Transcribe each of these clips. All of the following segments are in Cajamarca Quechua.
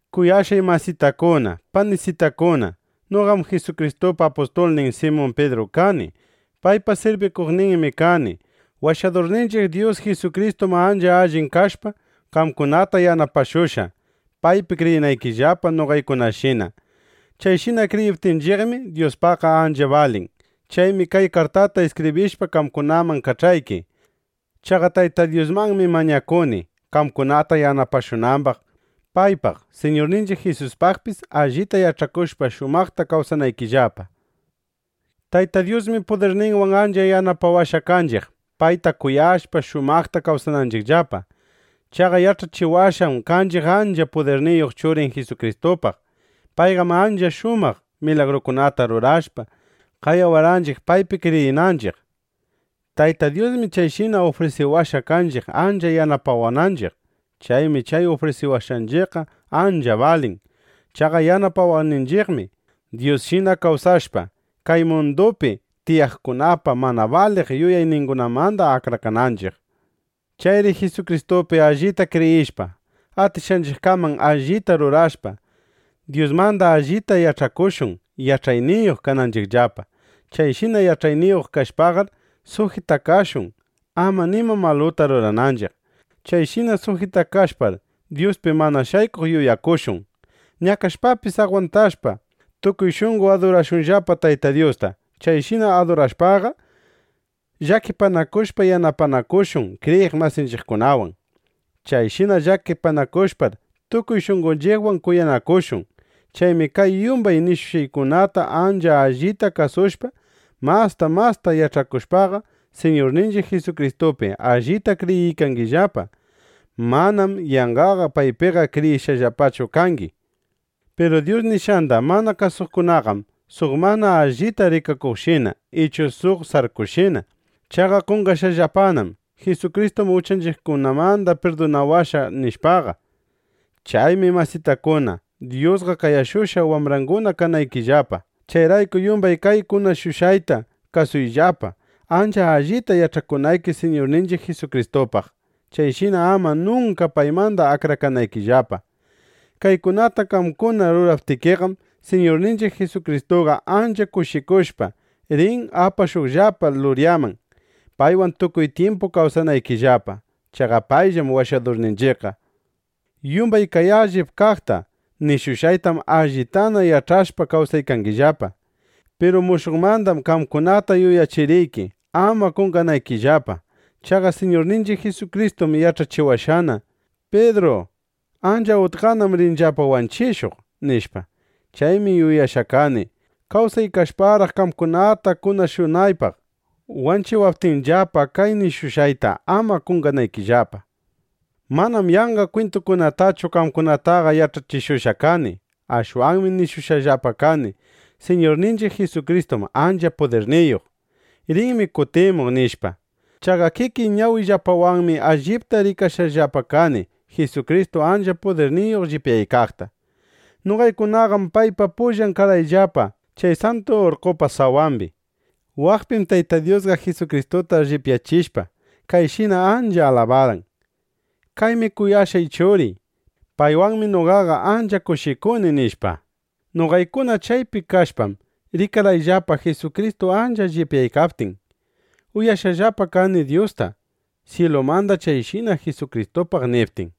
Kuyashqay masitakuna, panisitakuna, noqam Jisukristupa apustulnin Simun Pidru kani. Paypa sirbikuqninmi kani. Washadurninchiq Dyus Jisukristum ancha allin kashpa, qamkunata yanapashushqa, paypi kriyinaykillapa noqaykunashina. Chayshina kriyiptinchiqmi, Dyuspaqqa ancha balin. Chaymi kay kartata iskibrishpa qamkunaman kach'ayki. Chaqa Tayta Dyusmanmi mañakuni, qamkunata yanapashunambaq, paypaq, Siñurninchiq Jisuspaqpis allita yach'akushpa, shumaqta kawsanaykillapa. Tayta Dyusmi pudirninwan ancha yanapawashqa kanchiq, payta kuyashpa, shumaqta kawsananchiqllapa. Chaqa yach'achiwashqam kanchiq ancha pudirniyuq Churin Jisukristupaq. Payqam ancha shumaq milagrukunata rurashpa, qayawarqanchiq, paypi kriyinanchiq. Tayta Dyusmi chayshina ufrisiwashqa kanchiq ancha yanapawananchiq. Chaymi chay ufrisiwashqanchiqqa ancha balin. Chaqa yanapawanchiqmi, Dyusshina kawsashpa, kay mundupi tiyaqkunapa mana baliq yuyayningunamanda akrakananchiq. Chayri Jisukristupi allita kriyishpa, atishqanchiqkaman allita rurashpa, Dyusmanda allita yach'akushun, yach'ayniyuq kananchiqllapa. Chayshina yach'ayniyuq kashpaqar, sujitakashun, ama nima maluta rurananchiq. Chayshina sujitakashpaqar, Dyuspi mana shaykuq yuyakushun. Ñakashpapis agwantashpa, tukuy shunqo adurashunllapa Tayta Dyusta. Chayshina adurashpaqa, llakipanakushpa yanapanakushun kriyiq masinchiqkunawan. Chayshina llakipanakushpar, tukuy shunqonchiqwan kuyanakushun. Chaymi kay yumbay nishushqaykunata ancha allita kasushpa, masta masta yach'akushpaqa, Siñurninchiq Jisukristupi allita kriyiykangillapa. Manam yanqaqa paypiqa kriyishqallapachu kangi. Piru Dyus nishqanda mana kasuqkunaqam suq mana allita rikakuqshina ichu suq sarkushina. Chaqa qonqashqallapanam: Jisukristum uchaykunamanda pirdunawashqa, nishpaqa. Chaymi masitakuna, Dyusqa qayashushqa, wambranguna kanaykillapa. Chayrayku yumbay kay kunashushqayta kasuyllapa, ancha allita yach'akunayki Siñurninchiq Jisukristupaq, chayshina ama nunka paymanda akrakanaykillapa. Kaykunata qamkuna ruraptikiqam, Siñurninchiq Jisukristuqa ancha kushikushpa, rin apashuqllapa luryaman, paywan tukuy tyimpu kawsanaykillapa. Chaqa payllam Washadurninchiqqa. Yumbay kay allip kaqta nishushqaytam allitana yach'ashpa kasuykangillapa. Piru mushuqmandam qamkunata yuyachiriyki, ama qonqanaykillapa. Chaqa Siñurninchiq Jisukristum yach'achiwashqana: “Pidru, ancha utqanam rinllapa wanchishuq”, nishpa. Chaymi yuyashqa kani, kawsaykashparaq qamkunata kunashunaypaq, wanchiwaptinllapa kay nishushqayta ama qonqanaykillapa. Manam yanqa kwintukunatachu qamkunataqa yach'achishushqa kani. Ashwanmi nishushqallapa kani: “Siñurninchiq Jisukristum ancha pudirniyuq. Rinmi kutimuq”, nishpa. Chaqa kikiy ñawiyllapawanmi allipta rikashqallapa kani Jisukristu ancha pudirniyuq llipyaykaqta. Noqaykunaqam paypa pullan karqayllapa chay santu urqqopa sawambi. Waqpim Tayta Dyusqa Jisukristuta llipyachishpa, kayshina ancha alabarqan: “Kaymi kuyashqay Churiy. Paywanmi noqaqa ancha kushikuni”, nishpa. Noqaykuna chaypi kashpam, rikarqayllapa Jisukristu ancha llipyaykaptin. Uyashqallapa kani Dyusta, syilumanda chayshina Jisukristupaq niptin.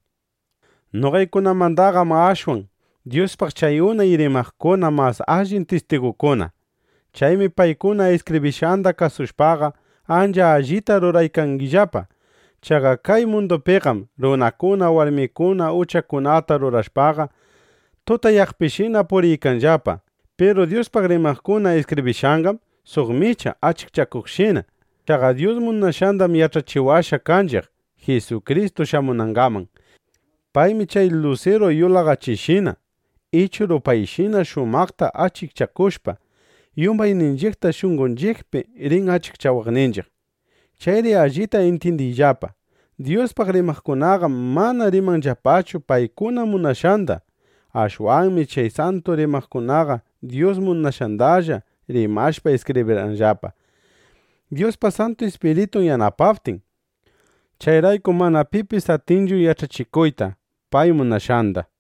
Noqaykunamandaqam ashwan Dyuspaq chay unay rimaqkuna mas allin tistigukuna. Chaymi paykuna iskibrishqanda kasushpaqa, ancha allita ruraykangillapa. Chaqa kay mundupiqam runakuna warmikuna uchakunata rurashpaqa, tutayaqpishina puriykanllapa. Piru Dyuspaq rimaqkuna iskibrishqanqam suq micha achikchakuqshina. Chaqa Dyus munashqandam yach'achiwashqam kanchiq, Jisukristu shamunangaman. Paymi chay lusiru yulaqachishina (yuraqachishina) ichu rupayshina shumaqta achikchakushpa, yumbayninchiqta shunqonchiqpi rin achikchawaqninchiq. Chayri allita intyindiyllapa: Dyuspaq rimaqkunaqam mana rimarqanllapachu paykuna munashqanda. Ashwanmi chay santu rimaqkunaqa Dyus munashqandalla rimashpa iskibrirqanllapa, Dyuspa Santu Ispiritun yanapaptin. Chayraykum mana pipis atinchu yach'achikuyta pay munashqanda, (Dyus nishqanda dañashpaqa).